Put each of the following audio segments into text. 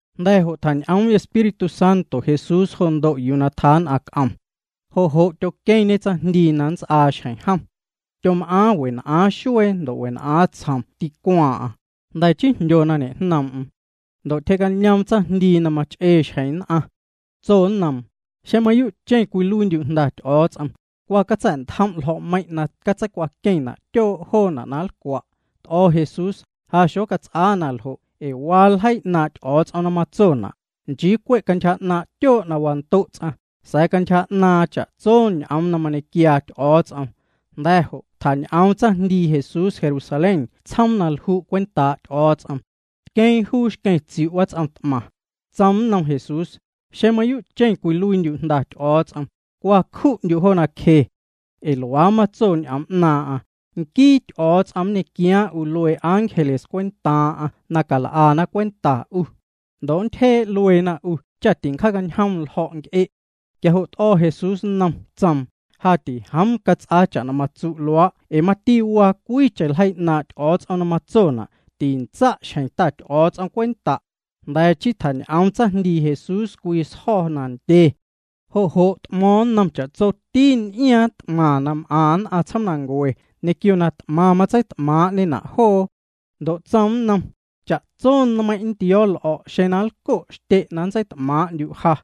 Jnda̱ jo' tjañ'oom Espíritu Santo Jesús jo ndo' yuu tjaa nn'aⁿ c'om. Jo' jo' tyoqueⁿñe tsaⁿjndii na nnts'aa xjeⁿ jom. Tyom'aaⁿ wen'aaⁿ xuee ndo' wen'aaⁿ tsjom tîcwaaⁿ'aⁿ, jnda̱ chii jndyo na ñejnoom'm. Ndo' tyje'cañoom tsaⁿjndii na mach'ee xjeⁿ nn'aⁿ. Tso nnoom: —Xeⁿ mayuu'cheⁿ cwiluiindyu' Jnda Ty'o̱o̱ts'om, cwa catsa̱'ntjom' ljo̱'meiiⁿ na catseicwaqueⁿna' tyoo' joona' na nlcwa'. T'o̱ Jesús: —Ja xocats'aa na ljo' ee waa ljeii 'naaⁿ' Ty'o̱o̱ts'om na matsona': “Nchii cwe' cantyja 'naaⁿ' tyoo' na wando' ts'aⁿ, sa̱a̱ cantyja 'naaⁿ cha'tso ñ'oom na mañequiaa Ty'o̱o̱ts'om.” Jnda̱ jo' tjañ'oom tsaⁿjndii Jesús Jerusalén tsjoom na lju' cwentaa' Ty'o̱o̱ts'om. Tqueeⁿ juu xqueⁿ tsiu' wats'om t'maⁿ. Tsoom nnom Jesús: —Xeⁿ mayuu'cheⁿ cwiluiindyu' Jnda Ty'o̱o̱ts'om, cwa cju'ndyu' jo nacje. Ee luaa matso ñ'oom 'naaⁿ'aⁿ: Nquii Ty'o̱o̱ts'om nñequiaaⁿ 'u luee ángeles cwentaaⁿ'aⁿ na cal'ana cwenta 'u. Ndo' nntyjee' lueena 'u cha tincjaacañjom ljo̱' nc'e'. Quia jo' t'o̱ Jesús nnom, tsoom: —Ja tijoom cats'aa cha'na matsu' luaa' ee mati waa cwiicheⁿ ljeii 'naaⁿ' Ty'o̱o̱ts'om na matsona': “Tintsa' xjeⁿ Ta Ty'o̱o̱ts'om cwenta'.” Jnda̱ chii tjañ'oom tsaⁿjndii Jesús cwii sjo̱ nandye. Jo' jo' t'mo̱o̱ⁿ nnom cha'tsoti n'iaaⁿ t'maⁿ na m'aⁿ nn'aⁿ tsjoomnancue, ñequio na t'maⁿ matseit'maaⁿ'ñena' joo. Ndo' tsoom nnom: —Cha'tso nmeiⁿ' nntio̱o̱ l'o̱' xeⁿ nlco' xtye' na nntseit'maaⁿ'ndyu' ja.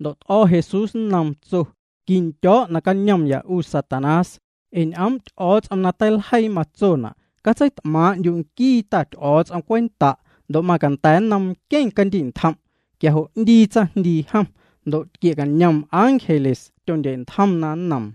Ndo' t'o̱ Jesús nnoom, tso: —Quindyo̱o̱' nacañomya 'u Satanás, ee ñ'oom' Ty'o̱o̱ts'om na teiljeii matsona': “Catseit'maaⁿ'ndyu' nquii Ta Ty'o̱o̱ts'om cwenta', ndo' macanda̱ nnom nqueⁿ candi'ntjom'.” Quia jo' 'ndii tsaⁿjndii jom. Ndo' tquie'cañom ángeles, tyondye'ntjomna nnoom.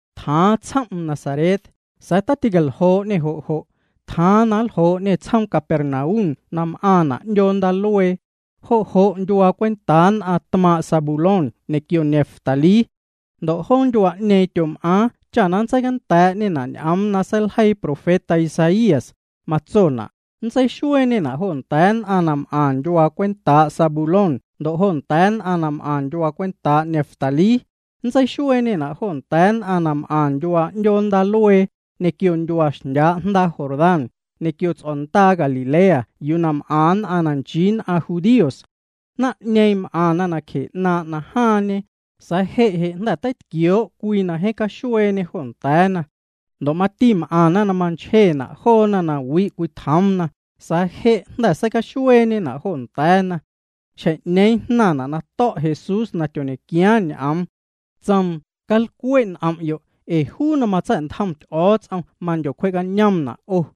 Tjaaⁿ tsjom'm Nazaret, sa̱a̱ taticaljoo'ñê jo' jo'. Tjaaⁿ na nljoo'ñê tsjoom Capernaum na m'aaⁿna' 'ndyoo ndaaluee. Jo' jo' ndyuaa cwentaa nn'aⁿ tmaaⁿ' Zabulón ñequio Neftalí. Ndo' joo ndyuaa'ñeeⁿ tyom'aaⁿ cha nntseicanda̱a̱'ñena' ñ'oom na seiljeii profeta Isaías, matsona': Nntseixueeñena' jo nda̱a̱ nn'aⁿ na m'aⁿ ndyuaa cwentaa' Zabulón ndo' jo nda̱a̱ nn'aⁿ na m'aⁿ ndyuaa cwentaa' Neftalí. Nntseixueeñena' jo nda̱a̱ nn'aⁿ na m'aⁿ ndyuaa 'ndyoo ndaaluee, ñequio ndyuaa xndyaa' jndaa Jordán, ñequio ts'o̱ndaa Galilea yuu na m'aⁿ nn'aⁿ na nchii nn'aⁿ judíos. Naⁿ'ñeeⁿ m'aⁿna nacje 'naaⁿ' najaaⁿñe, sa̱a̱ je' je' jnda̱ teitquioo' cwii na jeeⁿ caxueeñe jo nda̱a̱na. Ndo' mati m'aⁿna na manchjena' joona na wi' cwitjoomna, sa̱a̱ je' jnda̱ seicaxueeñena' jo nda̱a̱na. Xjeⁿ'ñeeⁿ jnaⁿna' na to̱' Jesús na tyoñequiaaⁿ ñ'oom. Tsoom: —Calcwe' n'om'yo', ee juu na matsa̱'ntjom Ty'o̱o̱ts'om mandyocwje'cañoomna' 'o.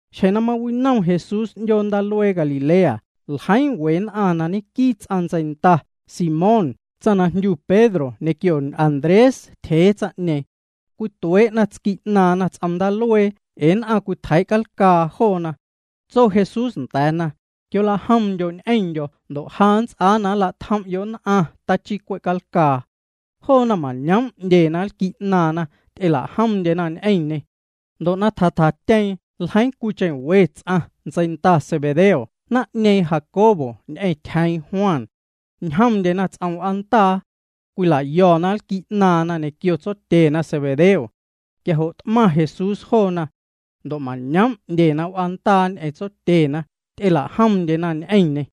Xjeⁿ na mawinom Jesús 'ndyoo ndaaluee Galilea, ljeiiⁿ we nn'aⁿ na ñenquii ts'aⁿ ntseinda, Simón, tsaⁿ na jndyu Pedro ñequio Andrés tyjee tsaⁿ'ñeeⁿ. Cwituee'na tsqui' 'naaⁿna ts'om ndaaluee ee nn'aⁿ cwitjeii' calcaa joona. Tso Jesús nda̱a̱na: —Quiolajomndyo' ñ'eⁿndyo̱ ndo' ja nnts'aa na nla'tjom'yo' nn'aⁿ tachii cwe' calcaa. Joona mañoom' 'ndyena nlqui' 'naaⁿna, ty'ela'jomndyena ñ'eⁿñê. Ndo' na tja tjatyeeⁿ ljeiiⁿ cwiicheⁿ we ts'aⁿ, ntseinda Zebedeo naⁿ'ñeeⁿ, Jacobo ñ'eⁿ tyjeeⁿ Juan. Ñjomndyena ts'om w'aandaa. Cwila'yo̱na nlqui' 'naaⁿna ñequio tsotyena Zebedeo. Quia jo' t'maⁿ Jesús joona. Ndo' mañoom' 'ndyena w'aandaa ñ'eⁿ tsotyena, ty'elajomndyena ñ'eⁿñê.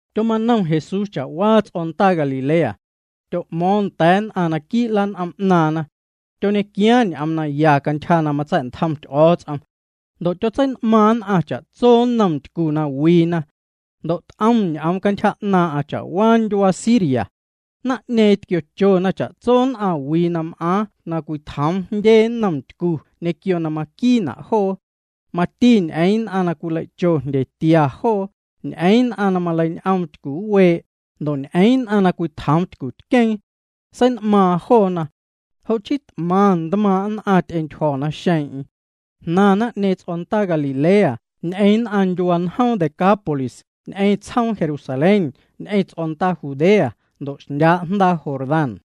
Tyomanom Jesús cha'waa ts'o̱ndaa Galilea. Tyo'mo̱o̱ⁿ nda̱a̱ nn'aⁿ naquii' lan'om 'naaⁿna. Tyoñequiaaⁿ ñ'oom naya cantyja na matsa̱'ntjom Ty'o̱o̱ts'om. Ndo' tyotsein'maaⁿ nn'aⁿ cha'tso nnom ntycu na wiina. Ndo' t'om ñ'oom cantyja 'naaⁿ'aⁿ cha'waa ndyuaa Siria. Naⁿ'ñeeⁿ tquiochona cha'tso nn'aⁿwii na m'aaⁿ na cwitjoom jndye nnom ntycu ñequio na maquiina' joo. Mati ñ'eeⁿ nn'aⁿ na cwilei'cho jndyetia joo, ñ'eeⁿ nn'aⁿ na maleiñ'oom tycuwee', ndo' ñ'eeⁿ nn'aⁿ na cwitjoom tycutqueeⁿ. Sein'maaⁿ joona. Jo' chii t'maⁿ ntmaaⁿ' nn'aⁿ ty'entyjo̱ naxeeⁿ'eⁿ. Jnaⁿ naⁿ'ñeeⁿ ts'o̱ndaa Galilea, ñ'eⁿ nn'aⁿ ndyuaa njoom Decápolis, ñ'eⁿ tsjoom Jerusalén, ñ'eⁿ ts'o̱ndaa Judea, ndo' xndyaa' jndaa Jordán.